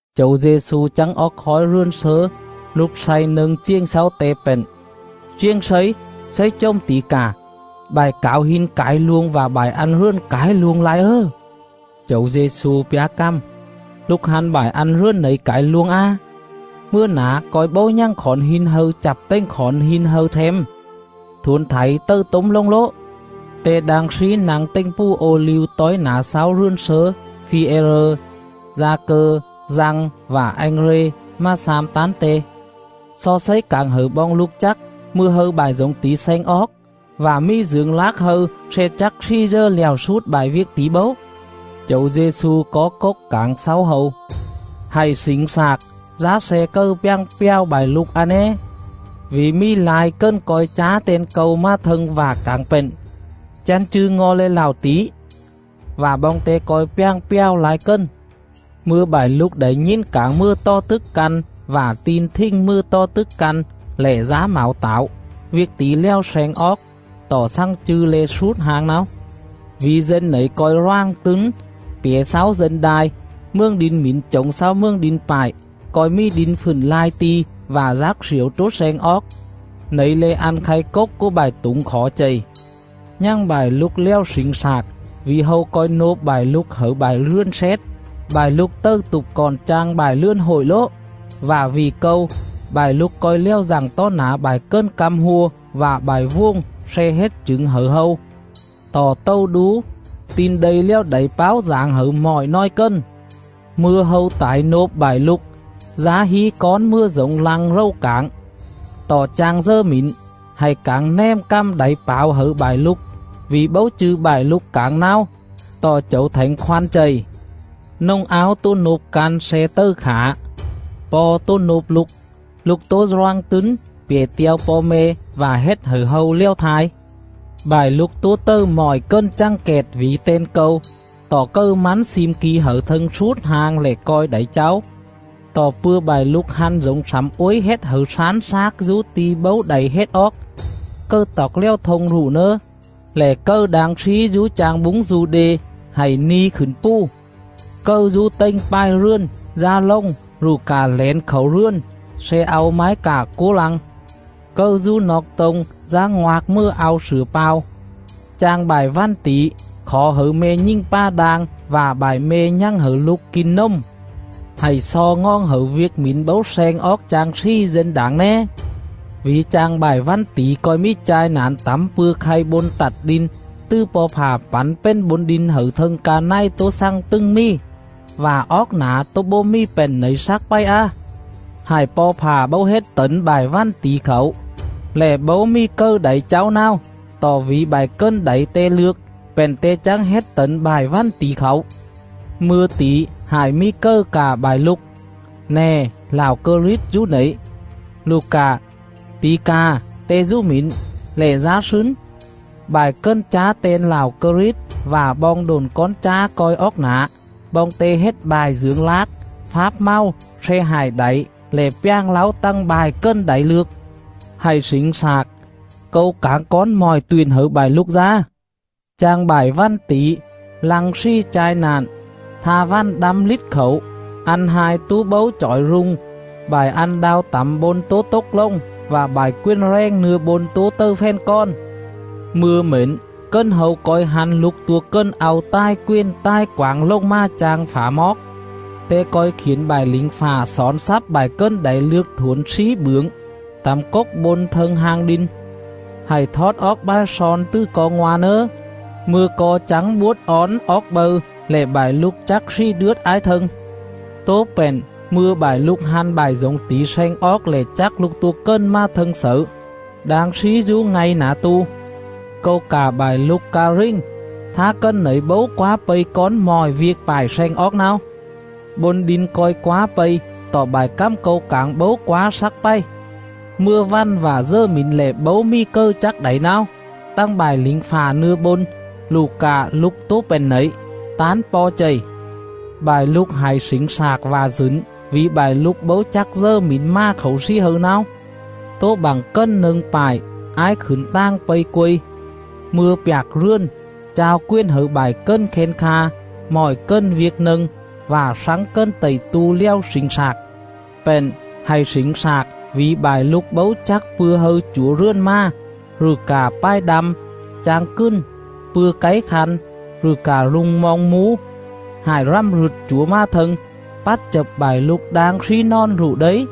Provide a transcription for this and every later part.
Chẩu Dê-xu chắng oóc khói rườn slớ lục slay nâng chiềng xáu Te pện: “Chiềng Slấy, Slấy chồm tỉ cà, bại cảo hin cải luông vạ bại ăn rườn cải luông lai ớ!” Chẩu Dê-xu pjá cằm: “Lục hăn bại ăn rườn nẩy cải luông á? Mừa nả co̱i bấu nhằng khỏn hin hâư chặp tềnh khỏn hin hâư them. Thuổn thảy tầư tốm lồng lố.” Te đang slí nă̱ng tềnh pù Ô-liu tói nả xáu rườn slớ, Phi-e-rơ, Da-cơ, Dăng, vạ Anh-rê mà xam tán Te: “Xo Slấy cảng hẩư boong lục chắc, mư̱a hâư bại dổng tỉ sleng oóc, vạ mì dưởng lác hâư sle chắc slì dờ lẹo slút bại viêc tỉ bấu?” Chẩu Dê-xu có cốc cảng xáu hâu: “Hạy slỉnh slạc, dá sle cầư pjàng pjào bại lục a né. Vỉ mì lai cần co̱i chá ten Câu mà thâng vạ cảng pện: ‘Chăn chư̱ ngo̱ le̱ lạo tỉ!’ vạ boong te co̱i pjàng pjào lai cần. Mư̱a bại lục đảy nhìn cảng mừa tò tức căn vạ tin thình mừa tò tức căn lẻ dá mảo tảo; viêc tỉ lèo sleng oóc, tọ xằng chư̱ le̱ slút hang náo. Vỉ dân nẩy co̱i roàng tứn pjẻ xáu dân đai, mường đin mỉn chổng xáu mường đin pại. Co̱i mì đin fựn lai ti̱ vạ dác sliểu tố sleng oóc. Nẩy le̱ ăn khay cốc cúa bại tủng khỏ Ccx: chếp pảng dú bươn. chầy. Nhằng bại lục lèo slỉnh slạc, vỉ hâu co̱i nôp bại lục hẩư bại rườn xét; Ccx: Hội đồng Công luận. bại lục tầư tụp cọn chang bại rườn hội lố; vạ vỉ Câu, bại lục co̱i lèo dặng tó nả bại cần căm hua vạ bại vuồng sle hết chửng hẩư hâu.. Tọ tầu đú, Tin Đây lèo đảy páo dảng hẩư mọi nòi cần. Mư̱a hâu tải nôp bại lục, dá hí cón mừa dổng lăng rầu cảng, tọ chang dờ mỉn, hạy cảng nèm cằm đảy pảo hẩư bại lục; vỉ bấu chư̱ bại lục cảng náo, tọ Chẩu Thảnh Khoăn chầy. Nồng áo tố nôp căn sle tầư khả; po̱ tố nôp lục; lục tố roàng tứn pjẻ te̱o po̱ me̱ vạ hết hẩư hâu lèo thai. Bại lục tố tầư mọi cần chằng kẹt vỉ ten Câu. Tọ cầư mắn slim ki hẩư thâng slút hang lẻ co̱i đảy cháu.. Tọ pư̱a bại lục hăn dổng slẳm uối hết hẩư slán slác dú ti̱ bấu đảy hết oóc (cầư toọc lèo thông rụ nớ), lẻ cầư đang slí dú chang búng Du-đê hạy ni khửn pù;. cầư dú tềnh pài rườn, dá lồng rụ cạ lẻn khảu rườn sle au mái cạ cúa lăng;. cầư dú noọc tô̱ng, dá ngoạc mừa au slửa pao. Chang bại vằn tỉ, khỏ hẩư me̱ nhình pà đang vạ bại me̱ nhằng hẩư lục kin nồm! Hạy xo ngoòng hẩư viêc mỉn bấu sleng oóc chang slì dên đảng né. Vỉ chang bại vằn tỉ co̱i mì chai na̱n tẳm pư̱a khay bôn tặt đin, tứ Po̱ Fạ pẳn pền bôn đin hẩư thâng ca này tố xằng tứng mì, vạ oóc nả tố bố mì pện nẩy slắc pày á.. Hại Po̱ Fạ bấu hết tẩn bại vằn tỉ khảu, lẻ bấu mì cầư đảy cháu náo; tọ vỉ bại cần đảy Te lược, pện Te chắng hết tẩn bại vằn tỉ khảu. Mư̱a tỉ hại mì cầư cạ bại lục: ‘Nè, Lạo Krit dú nẩy!’ rụ cạ ‘Tỉ cà, Te dú mỉn!’ lẻ dá slứn. Bại cần chá ten Lạo Krit vạ boong độn cón chá co̱i oóc nả; boong te hết bại dưởng lác, fáp mầu sle hại đảy lẻ pjàng láu tằng bại cần đảy lược. Hạy slỉnh slạc. Câu cảng cón mọi tuyện hẩư bại lục dá. Chang bại vằn tỉ, lăng slì chai na̱n, Tha vằn đăm lít khảu, Ăn hai tố bấu chỏi rung,. Bại ăn đao tẳm bôn tố tốc lồng, Vạ bại quền rèng nưa bôn tố tầư fèn kòn.. Mư̱a mển cần hâu co̱i hăn Lục Tua Cần au tài quền tài quảng lồng mà chang phả moóc.. Te co̱i khiển bại lỉnh fạ xỏn xắp bại cần đảy lược thuổn slí bưởng, tẳm cốc bôn thâng hang đin. Hạy thót oóc bài slon tứ co ngoa̱ nớ, mư̱a co chắng buốt ón oóc bâư lẻ bại lục chắc slì đướt ái thâng. Tố pện mư̱a bại lục hăn bại dổng tỉ sleng oóc lẻ chắc Lục Tua Cần mà thâng xẩư, đang slí dú ngay nả tu. Câu cạ bại lục ca rình, thá cần nẩy bấu quá pây cón mọi viêc pại sleng oóc náo. Bôn đin co̱i quá pây, tọ bại cằm Câu cảng bấu quá slắc pày. Mừa vằn vạ dờ mỉn lẻ bấu mì cầư chắc đảy náo, tằng bại lỉnh fạ nưa bôn, rụ cạ Lục tố pện nẩy, tán Po̱ chầy.. Bại lục hạy slỉnh slạc vạ dửn vỉ bại lục bấu chắc dờ mỉn mà khảu slì hâư náo. Tố bặng cần nâng pại ái khửn tàng pây quây, mư̱a pjạc rườn, chao quền hẩư bại cần khen kha, mọi cần viêc nâng, vạ slắng cần tậy tu lèo slỉnh slạc.. Pện, hạy slỉnh slạc vỉ bại lục bấu chắc pư̱a hâư chủa rườn mà, rụ cạ pài đăm, chang cừn, pư̱a cáy khăn, rụ cạ rung moong mú, hại rằm rựt chủa mà thâng, pắt chập bại lục đang slí nòn rụ đây.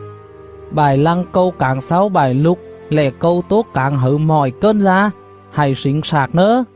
Bại lăng Câu cảng xáu bại lục lẻ Câu tố cảng hẩư mọi cần dá: Hạy slỉnh slạc nớ!”